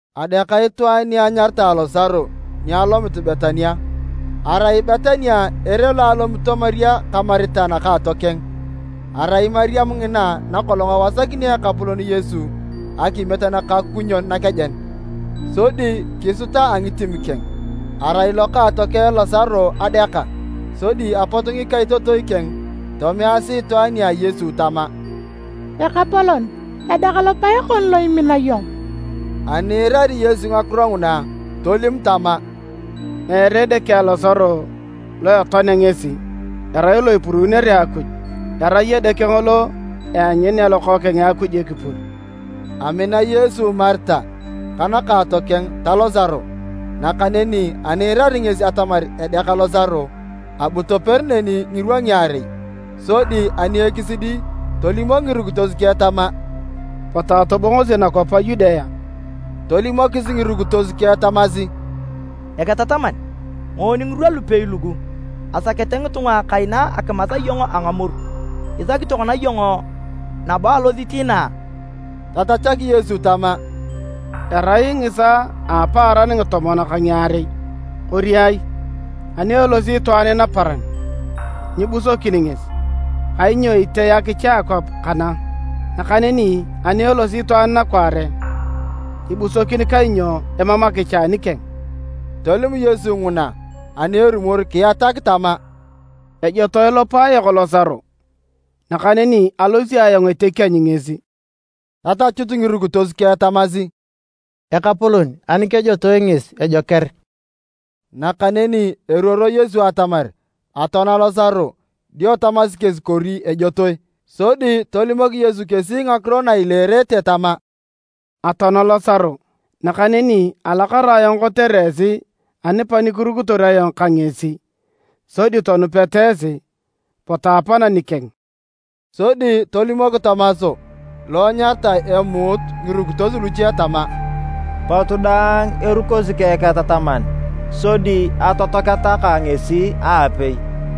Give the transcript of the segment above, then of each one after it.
Adeaka itwaan ni anyaritae Losaro ni alomit Betania. Arai Betania ere lo alomito Mariam ka Marita nakaatokeng. ( Arai Mariam ngina nakolong ewasakini Ekapolon Yesu akimiet nakakukunyon nakejen, sodi kisuta a ngitim keng, arai lokaatokeng Losaro adeaka.) Sodi apot ngikaitotoi keng tomeasi itwaan nia Yesu tama, “Ekapolon, edeak lopae kon lo imina iyong.” Ani iirari Yesu ngakiro nguna, tolim tama, “Meere edeke a Losaro lo etoanea ngesi, erai lo ipuruunere Akuj, erai edeke ngolo eanyunea Lokookeng a Akuj ekipur.” Amina Yesu Marita ka nakaatokeng ta Losaro. Nakaneni ani iirari ngesi atamar edeak Losaro, abu toper neni ngirwa ngiarei. Sodi ani ekisidi tolimok ngirukitos keng tama, “Potu atobongosi nakwap a Yudea.” Tolimokis ngirukitos keng tamasi, “Eketataman, ngoon ngirwa lupei lugu, asakete ngitunga kaina akimas iyong a ngamoru, isaki tokona iyong nabo alosit inaa?” Tatachak Yesu tama, “Erai ngisaa a apaaran ngitomon ka ngiarei, kori ai? Ani elosi itwaan naparan, nyibusokin ngesi, kainyo itee akicha a akwap kana. Nakaneni ani elosi itwaan nakwaare, ibusokin kainyo emam akicha anikeng.” Tolim Yesu nguna ani erumor kiatak tama, “Ejotoe lopae yok Losaro, nakaneni alosi ayong etekienyu ngesi.” Tatachut ngirukitos keng tamasi, “Ekapolon, ani kejotoe ngesi ejoker.” Nakaneni eruoro Yesu atamar atoana Losaro dio tamasi kesi kori ejotoe. Sodi tolimok Yesu kesi ngakiro na ileerete tama, “Atoana Losaro. Nakaneni alakara ayong kotere esi anipakirukitor ayong ka ngesi, sodi tonupeta esi. Potu apana nikeng.” Sodi tolimok Tomas (lo enyaritae emuut) ngirukitos luche tama, “Potu daang erukosi ka Eketataman sodi atotoaketa ka ngesi aapei!”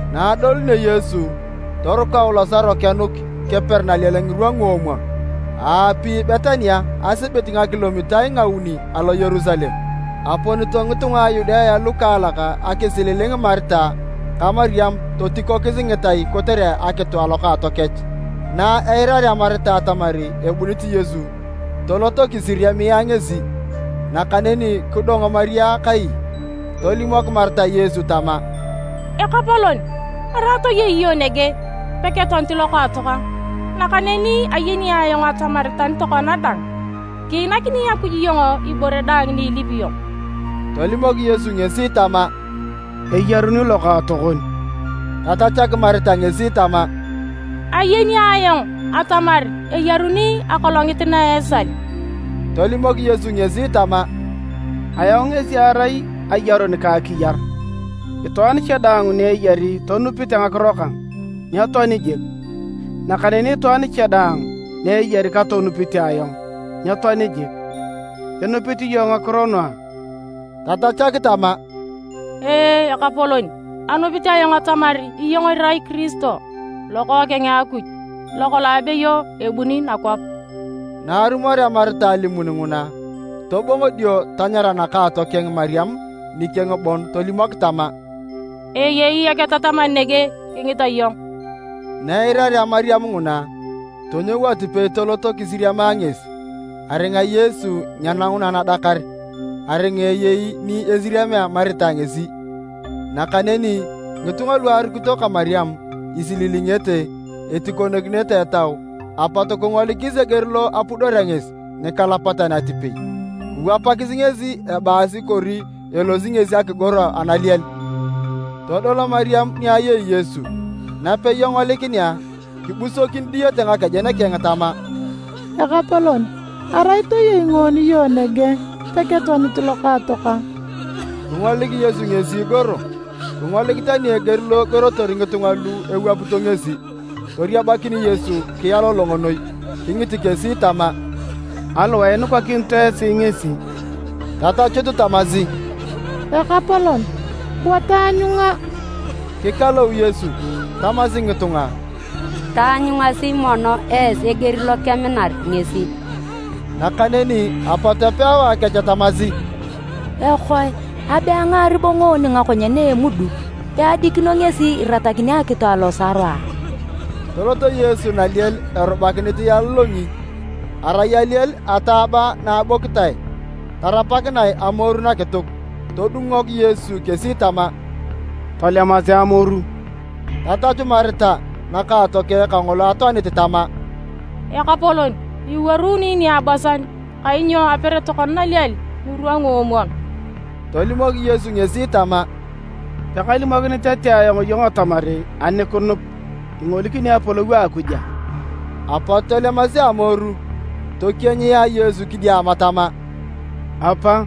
Na adolunio Yesu, torukou Losaro kenuk keper naliel ngirwa nguomwon. Aapi Betania asibit ngakilomitae ngauni alo Yerusalem, aponito ngitunga a Yudea lukaalak akisililing Marita ka Mariam totikokis ngitai kotere akitu alokaatokech. Na eirarea Marita atamar ebunit Yesu, tolot kisiriamia ngesi, nakaneni kidong Mariam kai. Tolimok Marita Yesu tama, “Ekapolon, arai toyei iyong nege, peketoanit lokaatokang! Nakaneni ayeni ayong atamar tani tokona dang, kiinakini Akuj iyong ibore daang ni ilipi iyong.” Tolimok Yesu ngesi tama, “Eyaruni lokaatokon.” Tatachak Marita ngesi tama, “Ayeni ayong atamar eyaruni akolongit na esal.” Tolimok Yesu ngesi tama, “Ayong ngesi arai ayarun ka akiyar, itwaan cha daang ni eyari tonupite ngakiro kang, nyetoani jik, nakaneni itwaan cha daang ni eyari katonupite ayong, nyetoani jik. Inupit iyong ngakiro nugu a?” Tatachak tama, “Ee, Ekapolon, anupit ayong atamar iyong irai Kiristo, Lokookeng a Akuj, lokolong abeyo ebuni nakwap.” Na arumorea Marita alimun nguna, tobongo dio tanyara nakaatokeng Mariam nikeng bon tolimok tama, “Eyei Eketataman nege kingita iyong.” Na eirarea Mariam nguna, tonyou atipei tolot kisiriamia ngesi. ( Aringa Yesu nyenanguna nadakar, aringa eyei ni esiriamea Marita ngesi.) Nakaneni ngitunga lu arukito ka Mariam isililingete etikokinito etau, apot kingolikis eger lo apudorea ngesi nikalapatan atipei. Kiwapakis ngesi ebaasi kori elosi ngesi akigoro analiel. Todol Mariam ni ayei Yesu napei engolikinea, kibusokin diyete ngakejen keng tama, “Ekapolon, arai toyei ngoon iyong nege, peketoanit lokaatokang!” Kingolik Yesu ngesi igoro, kingolik tani eger lo egorotor ngitunga lu ewapito ngesi, toriabakin Yesu kialolong noi. Kingit kesi tama, “Aliwae inukakinito esi ngesi?” Tatachut tamasi, “Ekapolon, bua taanyunga.” Kikalou Yesu. Tamasi ngitunga, “Taanyungasi mono esi eger lokeminar ngesi!” Nakaneni apot epewae kech tamasi, “Ekoe! Abe angaari bo ngoon ngakonyen a emuduk. Peadikino ngesi iratakini akitu a Losaro a?” Tolot Yesu naliel erubakinit ialolongi. Arai aliel ataaba na abokitae tarapakinae amoru nakituk. Todungok Yesu kesi tama, “Tolemasi amoru!” Tatachu Marita nakaatokeng kangolo atoanit tama, “Ekapolon, iwuaruni niabosan kainyo aper tokona naliel ngirwa nguomwon!” Tolimok Yesu ngesi tama, “Pekalimokinit tete ayong iyong atamar ani kinup, ingolikini apolou a Akuj a?” Apot tolemasi amoru, tokienyia Yesu kidiama tama, “Apa,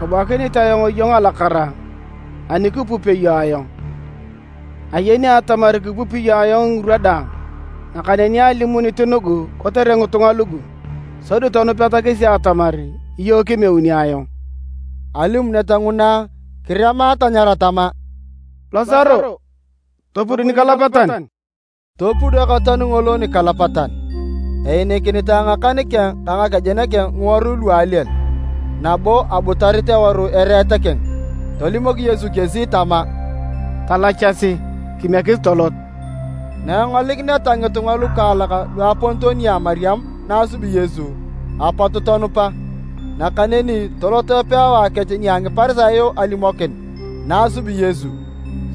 kabuakinit ayong iyong alakara ani kipupio iyong ayong. Ayeni atamar kipupi iyong ayong ngirwa daang. Nakaneni alimunit nugu kotere ngitunga lugu, sodi tonupeta kesi atamar iyong kimeuni ayong.” Alimunet nguna, kirema tanyara tama, “Losaro, topud nikalapatan!” Topud ekatoan ngolo nikalapatan, einikinitae ngakan keng ka ngakejen ngiworui lu aliel, nabo abutarit eworu ereet keng. Tolimok Yesu kesi tama, “Talachasi kimiekis tolot.” Na engolikineta ngitunga lukaalak luaponito nia Mariam na asubi Yesu, apot tonupa. Nakaneni tolot epewae kech nia Ngiparisayo alimokin na asubi Yesu.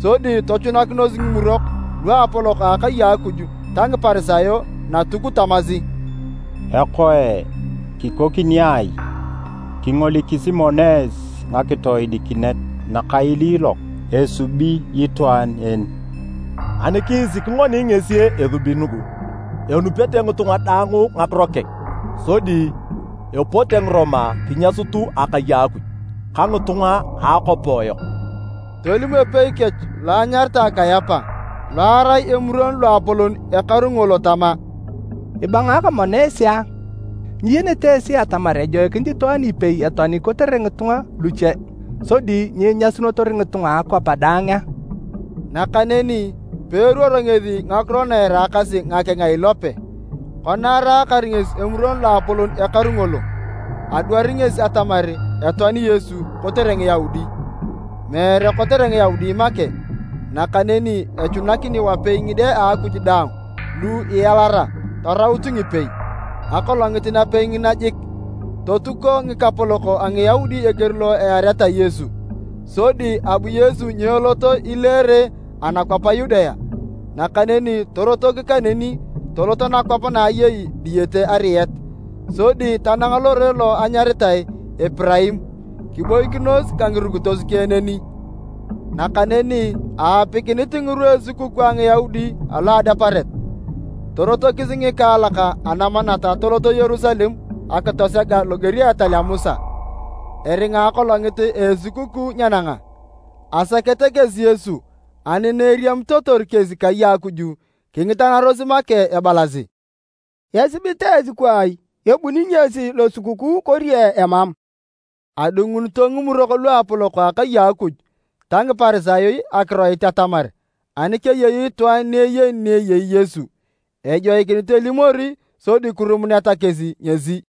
Sodi tochunakinos Ngimurok Luapolok a akai a Akuj ta Ngiparisayo Natuk tamasi, “Ekoe, kikoni ai? Kingolikisi mono esi ngakitoodikinet nakailiilok esubi itwaan en! Ani kiisik ngoni ngesi esubi nugu, enupete ngitunga daang ngakiro keng, sodi epote Ngiroma kinyasut akai a Akuj ka ngitunga a akwap yok!” Tolim epei kech lo enyaritae Kayapa, lo arai Emuron Loapolon ekaru ngolo tama, “Ibangaaka mono esi a? Nyiyenete esi atamar ejoikinit itwaan ipei etoani kotere ngitunga luche sodi nyinyasunotor ngitunga a akwap daang a?” Nakaneni, peeruoro ngesi ngakiro na eraakasi ngakeng a ilope. Kona araakar ngesi Emuron Loapolon ekaru ngolo, adwari ngesi atamar etoani Yesu kotere Ngiyaudi, meere kotere Ngiyaudi make, nakaneni echunakini wapei ngide a Akuj daang lu ialara taraut ngipei. Akolongit napei ngina jik, totuko ngikapolok a Ngiyaudi eger lo eareta Yesu. Sodi abu Yesu nyelot ileere anakwap a Yudea, nakaneni torotok kaneni tolot nakwap na ayei diyete ariet, sodi tanang lore lo anyaritae Epiraim, kiboikinos ka ngirukitos keng neni. Nakaneni aapikinit ngirwa a esukukuu a Ngiyaudi alo a Adeparet. Torotokis ngikaalak anamanat toloto Yerusalem akitosega loger a etal a Musa, eringa akolongit a esukukuu nyenanga. Asakete kesi Yesu, ani na eriamitotor kesi kai a Akuj, kingitanaros make ebalasi, “Esibit esi kwaai? Ebuni ngesi Losukukuu kori emam?” Adungunito Ngimurok Luapolok a akai a Akuj ta Ngiparisayo akiroit atamar, ani keyei itwaan ni eyeni ni eyei Yesu, ejoikinit elimori sodi kirumuneta kesi ngesi.